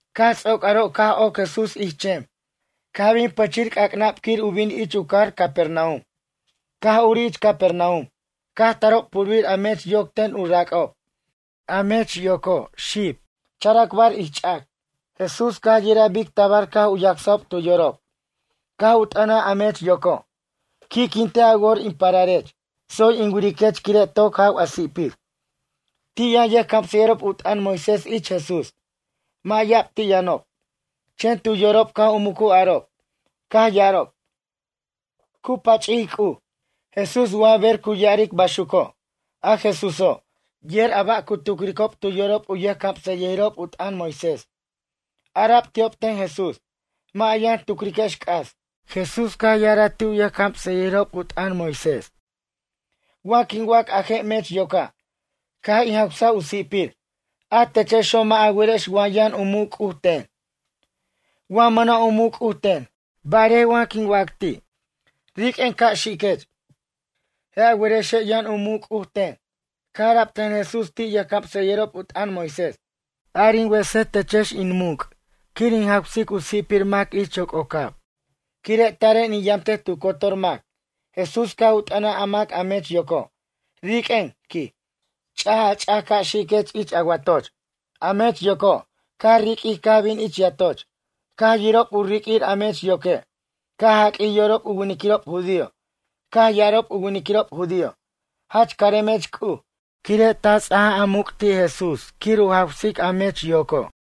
Caj ts'oc aro' caj oc Jesús ich chem. Caj bin pʌchir c'ac'nab quir u bin ich u cajar Capernaum. Caj urij ich Capernaum. Caj tarob purbir a mech yoc ten u rac'ob. A mech yoco' xib, characbar ich ch'ac. Jesús caj u yiraj bic tabar caj u yacsajob tu yorob, caj u t'ʌnaj a mech yoco': ―Qui'quintej a wor in pararech. Tsoy in wiriquech quire' toc jaw a si'pir. Ti' yʌn yʌjcamsʌyʌjirob u t'ʌn Moisés ich Jesús. Mʌ' ya'ab ti' yʌnob. Chen tu yorob caj u mucu arob, caj ya'arob: “Cu pach'ic C'uj, Jesús wa ber cu ya'aric baxuco'.” A Jesúso', yer a ba' cu tucricob tu yorob a yʌjcamsʌyʌjirob u t'ʌn Moisés. Ara'b ti'ob ten Jesús: ―Mʌ' a yʌn tucriquex c'as. Jesús caj ya'araj ti' yʌjcamsʌyʌjirob u t'ʌn Moisés: ―Wa quin wac a je' mech yoca': “Caj in jawsaj a si'pir”, a techexo' mʌ' a werex wa yʌn u muc' C'uj ten, wa mʌna' u muc' C'uj ten. Barej wa quin wac ti': “Riq'uen ca' xiquech.” Je' a werexe' yʌn u muc' C'uj ten. Caj ara'b ten Jesús ti' yʌjcamsʌyʌjirob u t'ʌn Moisés: ―Ar in wesej techex in muc' quir in jawsic u si'pir mac ich yoc'ocab, quire' taren in yamtej tu cotor mac. Jesús caj u t'ʌnaj a mac a mech yoco': ―Riq'uen ―quij―. Ch'aj a ch'ac ca' xiquech ich a watoch. A mech yoco', caj riq'uij caj bin ich yatoch. Caj yirob u riq'uir a mech yoque', caj jaq'uij yorob u winiquirob judío. Caj ya'arob u winiquirob judío: ―Jach caremech C'uj, quire' ta ts'aja muc' ti' Jesús quir u jawsic a mech yoco'.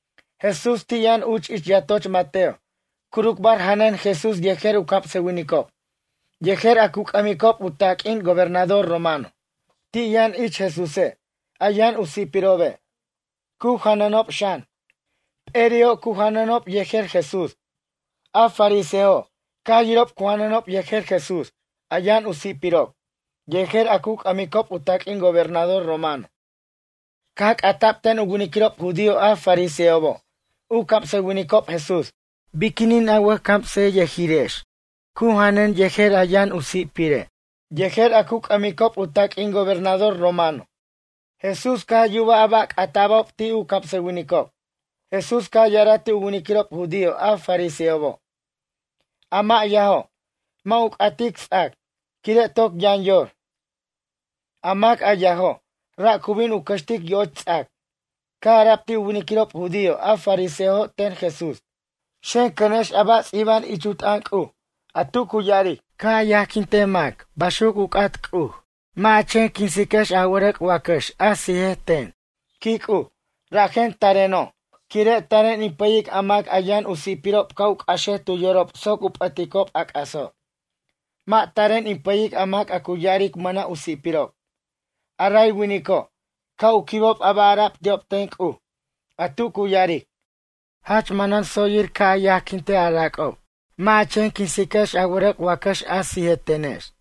Jesús ti' yʌn uch ich yatoch Mateo. Curucbar janʌn Jesús yejer u camsʌwinicob, yejer a cu c'ʌmicob u taq'uin gobernador romano. Ti' yʌn ich Jesúse', a yʌn u si'pirobe', cu janʌnob xan. P'eri'o' cu janʌnob yejer Jesús. A farisejo', caj yirob cu janʌnob yejer Jesús, a yʌn u si'pirob, yejer a cu c'ʌmicob u taq'uin gobernador romano. Caj c'ata'b ten u winiquirob judío a fariseobo', u camsʌwinicob Jesús: ―Biquinin a wʌjcamsʌyʌjirex cu janʌn yejer a yʌn u si'pire', yejer a cu c'ʌmicob u taq'uin gobernador romano? Jesús caj yubaj a ba' c'ata'bob ti' u camsʌwinicob. Jesús caj ya'araj ti' u winiquirob judío a fariseobo': ―A mʌ' yajo', mʌ' u c'atic ts'ac, quire' toc yʌn yor. A mac a yajo', ra' cu bin u cʌxtic yo'och ts'ac. Caj ara'b ti' u winiquirob judío a fariseojo' ten Jesús: ―Xen, cʌnex a ba' ts'iba'an ich u t'ʌn C'uj, a tu cu ya'aric: “Ca' yajquinte mac baxuc u c'at C'uj. Mʌ' a chen quinsiquex a wʌrʌc' wacʌx a sija ten”, quij C'uj. Rajen tareno'. Quire' taren in pʌyic a mac yʌn u si'pirob ca' u c'axej tu yorob soc u p'ʌticob a c'aso'. Mʌ' taren in pʌyic a mac a cu ya'aric mʌna' u si'pirob. A ray winico', ca' u quibob a ba' ara'b ti'ob ten C'uj, a tu cu ya'aric: “Jach manan tsoyir ca' a yajquintej a rac'ob. Mʌ' ja chen quinsiquex a wʌrʌc' wacʌx a sijetenex.”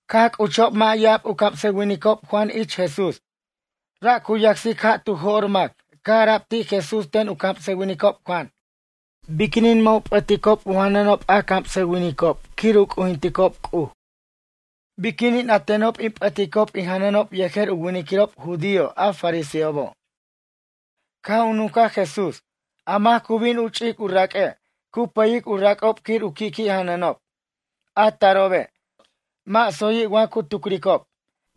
Caj c'uchob mʌ' ya'ab u camsʌwinicob Juan ich Jesús. Ra' cu yacsic ja' tu jo'r mac. Caj ara'b ti' Jesús ten u camsʌwinicob Juan: ―Biquinin mʌ' u p'ʌticob u janʌnob a camsʌwinicob quir u c'ujinticob C'uj? Biquinin a tenob in p'ʌticob in janʌnob yejer u winiquirob judío a fariseobo'? Caj u nuncaj Jesús: ―A mac cu bin u ch'ic u raq'ue', cu pʌyic u rac'ob quir u qui'qui' janʌnob. A tarobe', mʌ' tsoyi' wa cu tucricob.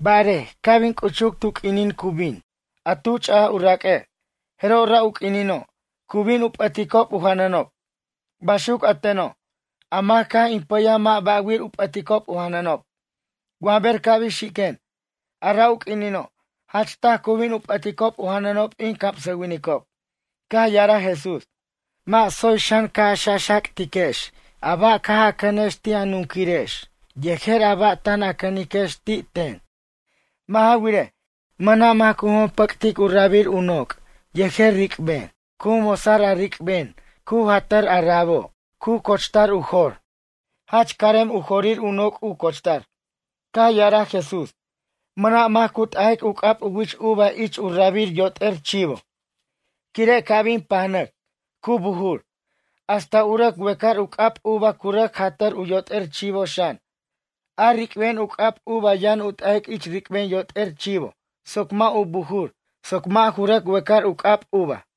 Barej ca' bin c'uchuc tu q'uinin cu bin, a tu ch'aj u raq'ue', jeroj ra' u q'uinino', cu bin u p'ʌticob u janʌnob. Baxuc a teno'. A mac a caj in pʌyaj mʌ' ba'wir u p'ʌticob u janʌnob. Wa ber ca' bin xiquen, a ra' u q'uinino', jach taj cu bin u p'ʌticob u janʌnob in camsʌwinicob. Caj ya'araj Jesús: ―Mʌ' tsoy xan ca' a xaxactiquex a ba' caj a cʌnex ti' a nunquirex yejer a ba' tan a cʌniquex ti' ten. Mʌ' ja wirej, mʌna' mac cu jompʌc'tic u rabir u noc' yejer ric'ben. Cu mosar a ric'ben cu jatar a rabo' cu cochtar u jor. Jach carem u jorir u noc' u cochtar. Caj ya'araj Jesús: ―Mʌna' mac cu t'ajtic u c'ab u wich uva ich u rabir yot'er chivo. Quire' ca' bin pajnʌc, cu bujur. Hasta u rʌc wecar u c'ab uva cu rʌc jatʌr u yot'er chivo xan. A ric'ben u c'ab uva yʌn u t'ajic ich ric'ben yot'er chivo soc mʌ' ju bujur soc mʌ' ju rʌc wecar u c'ab uva.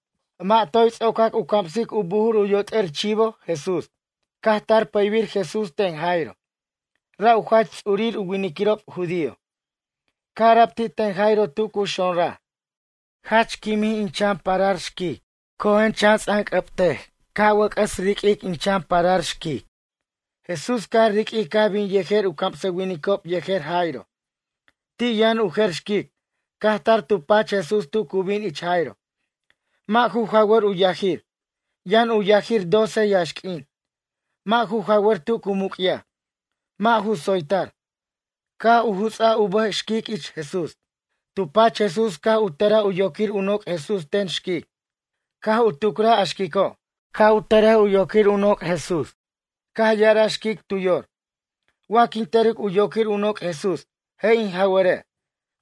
Mʌ' toy ts'ocac u camsic u bujur u yot'er chivo Jesús. Caj tar pʌybir Jesús ten Jairo. Ra' u jach ts'urir u winiquirob judío. Caj ara'b ti' ten Jairo tu cu xonraj: ―Jach quimin in chan parar xquic. Cojen, chan ts'anc'ʌbtej ca' wʌc'ʌs riq'uir in chan parar xquic. Jesús caj riq'uij caj bin yejer u camsʌwinicob yejer Jairo. Ti' yʌn u jer xquic, caj tar tu pach Jesús tu cu bin ich Jairo. Mʌ' ju jawʌr u yajir. Yʌn u yajir doce yaxq'uin. Mʌ' ju jawʌr tu cu muc'yaj. Mʌ' ju tsoytar. Caj u juts'aj u bʌj xquic ich Jesús. Tu pach Jesús caj u tʌra u yoquir u noc' Jesús ten xquic. Caj u tucraj a xquico', ca' u tʌrej u yoquir u noc' Jesús. Caj ya'araj xquic tu yor: “Wa quin tʌric u yoquir u noc' Jesús, je' in jaware'.”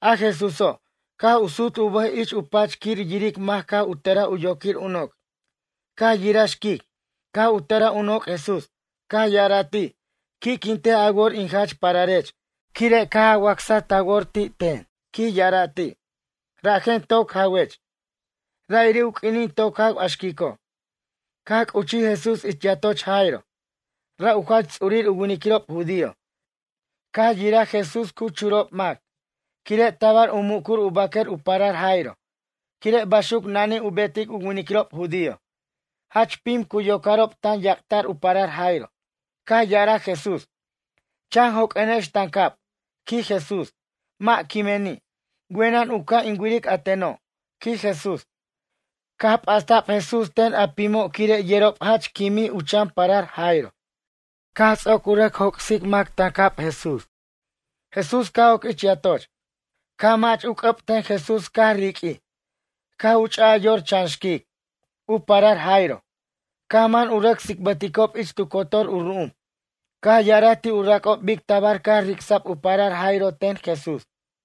A Jesúso', caj u sut u bʌj ich u pach quir yiric mac caj u tʌraj u yoquir u noc'. Caj yiraj xquic, caj u tʌraj u noc' Jesús. Caj ya'araj ti': ―Qui'quintej a wor in jach pararech. Quire' caj a wacsaj ta wor ti' ten ―quij ya'araj ti'―, rajen toc jawech. Ra'iri' u q'uinin toc jaw a xquico'. Caj c'uchij Jesús ich yatoch Jairo. Ra' u jach ts'urir u winiquirob judío. Caj yiraj Jesús cu churob mac, quire' tabar u mucur u baquer u parar Jairo, quire' baxuc nanij u betic u winiquirob judío. Jach pim cu yoc'arob tan yac'ta'r u parar Jairo. Caj ya'araj Jesús: ―Chan joq'uenex tancab ―quij Jesús―. Mʌ' quimeni'. Wenʌn u ca' in wiric a teno' ―quij Jesús. Caj p'asta'b Jesús ten a pimo' quire' yerob jach quimij u chan parar Jairo. Caj ts'oc u rʌc joc'sic mac tancab Jesús. Jesús caj oc ich yatoch, caj mach u c'ʌb ten Jesús caj riq'uij. Caj u ch'a'aj yor chan xquic, u parar Jairo. Caj man u rʌc tsicbʌticob ich tu cotor u ru'um. Caj ya'araj ti' u rac'ob bic tabar caj ric'sa'b u parar Jairo ten Jesús.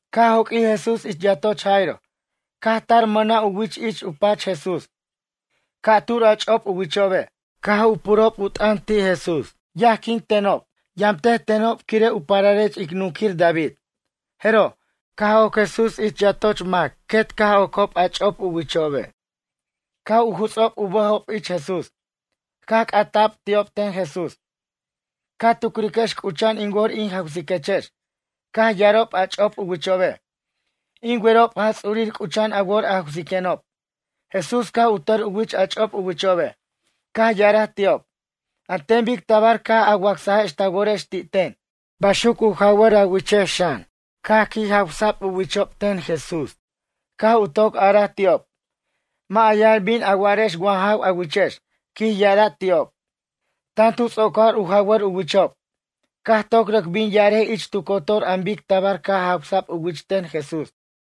Caj joq'uij Jesús ich yatoch Jairo. Caj tar mʌna' u wich ich u pach Jesús. Ca'tur a ch'op u wichobe'. Caj u purob u t'ʌn ti' Jesús: ―Yajquin tenob, yamtej tenob quire' u pararech ic nunquir David. Jeroj, caj oc Jesús ich yatoch mac quet caj ocob a ch'op u wichobe'. Caj u jutsob u bʌjob ich Jesús. Caj c'ata'b ti'ob ten Jesús: ―Ca tucriquex c'ucha'an in wor in jawsiquechex? Caj ya'arob a ch'op u wichobe': ―In werob Jaj Ts'urir c'ucha'an a wor a jawsiquenob. Jesús caj u tʌr u wich a ch'op u wichobe'. Caj ya'araj ti'ob: ―An ten bic tabar caj a wacsajex ta worex ti' ten, baxuc u jawʌr a wichex xan. Caj qui' jawʌc u wichob ten Jesús. Caj u toc araj ti'ob: ―Mʌ' a yʌn bin a wa'arex wa jaw a wichex ―quij ya'araj ti'ob. Tan tu ts'ocar u jawar u wichob. Caj toc rʌc bin ya'arej ich tu cotor an bic tabar caj jawsa'b u wich ten Jesús.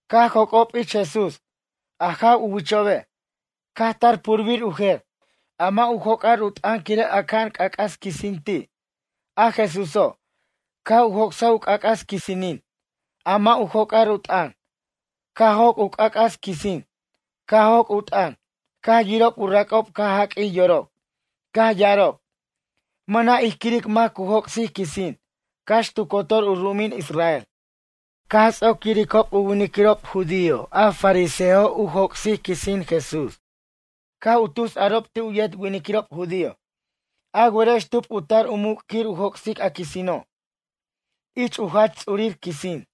Caj joc'ob ich Jesús, a jaw u wichobe', caj ca' tar purbir u jer. A mʌ' u joc'ar u t'ʌn quire' aca'an c'ac'as quisin ti'. A Jesúso', caj u joc'saj u c'ac'as quisinin, a mʌ' u joc'ar u t'ʌn. Caj joc' u c'ac'as quisin, caj joc' u t'ʌn. Caj yirob u rac'ob caj jaq'uij yorob. Caj ya'arob: ―Mʌna' ij quiric mac cu joc'sic quisin. Cax tu cotor u ru'umin Israel. Caj ts'oc yiricob u winiquirob judío a fariseojo' u joc'sic quisin Jesús. Caj u tus arob ti' u yet winiquirob judío: ―A werex tub u tar u muc' quir u joc'sic a quisino'? Ich u jach ts'urir quisin.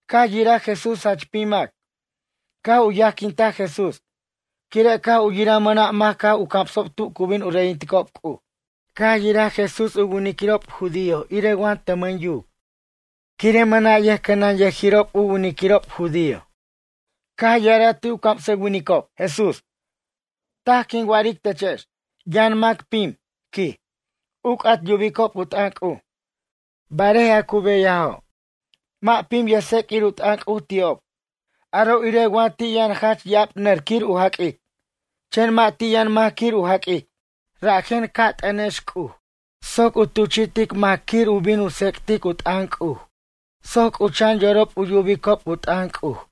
Caj yiraj Jesús jach pim mac, caj u yajquinta Jesús, quire' caj u yiraj mʌna' mac caj u camsob tu cu bin u reyinticob C'uj. Yiraj Jesús u winiquirob judío irej wa tʌmʌn yuc, quire' mʌna' yʌjcʌnʌnyʌjirob u winiquirob judío. Caj ya'araj ti' u camsʌwinicob, Jesús: ―Taj quin wa'aric techex. Yʌn mac pim ―quij―, u c'at yubicob u t'ʌn C'uj. Barej a cu beyajo', mʌ' pim yʌjtseq'uir u t'ʌn C'uj ti'ob. Aro' irej wa ti' yʌn jach ya'ab nʌr quir u jaq'uic, chen mʌ' ti' yʌn mac quir u jaq'uic. Rajen ca' t'ʌnex C'uj soc u tuchi'tic mac quir u bin u tsec'tic u t'ʌn C'uj soc c'ucha'an yorob u yubicob u t'ʌn C'uj.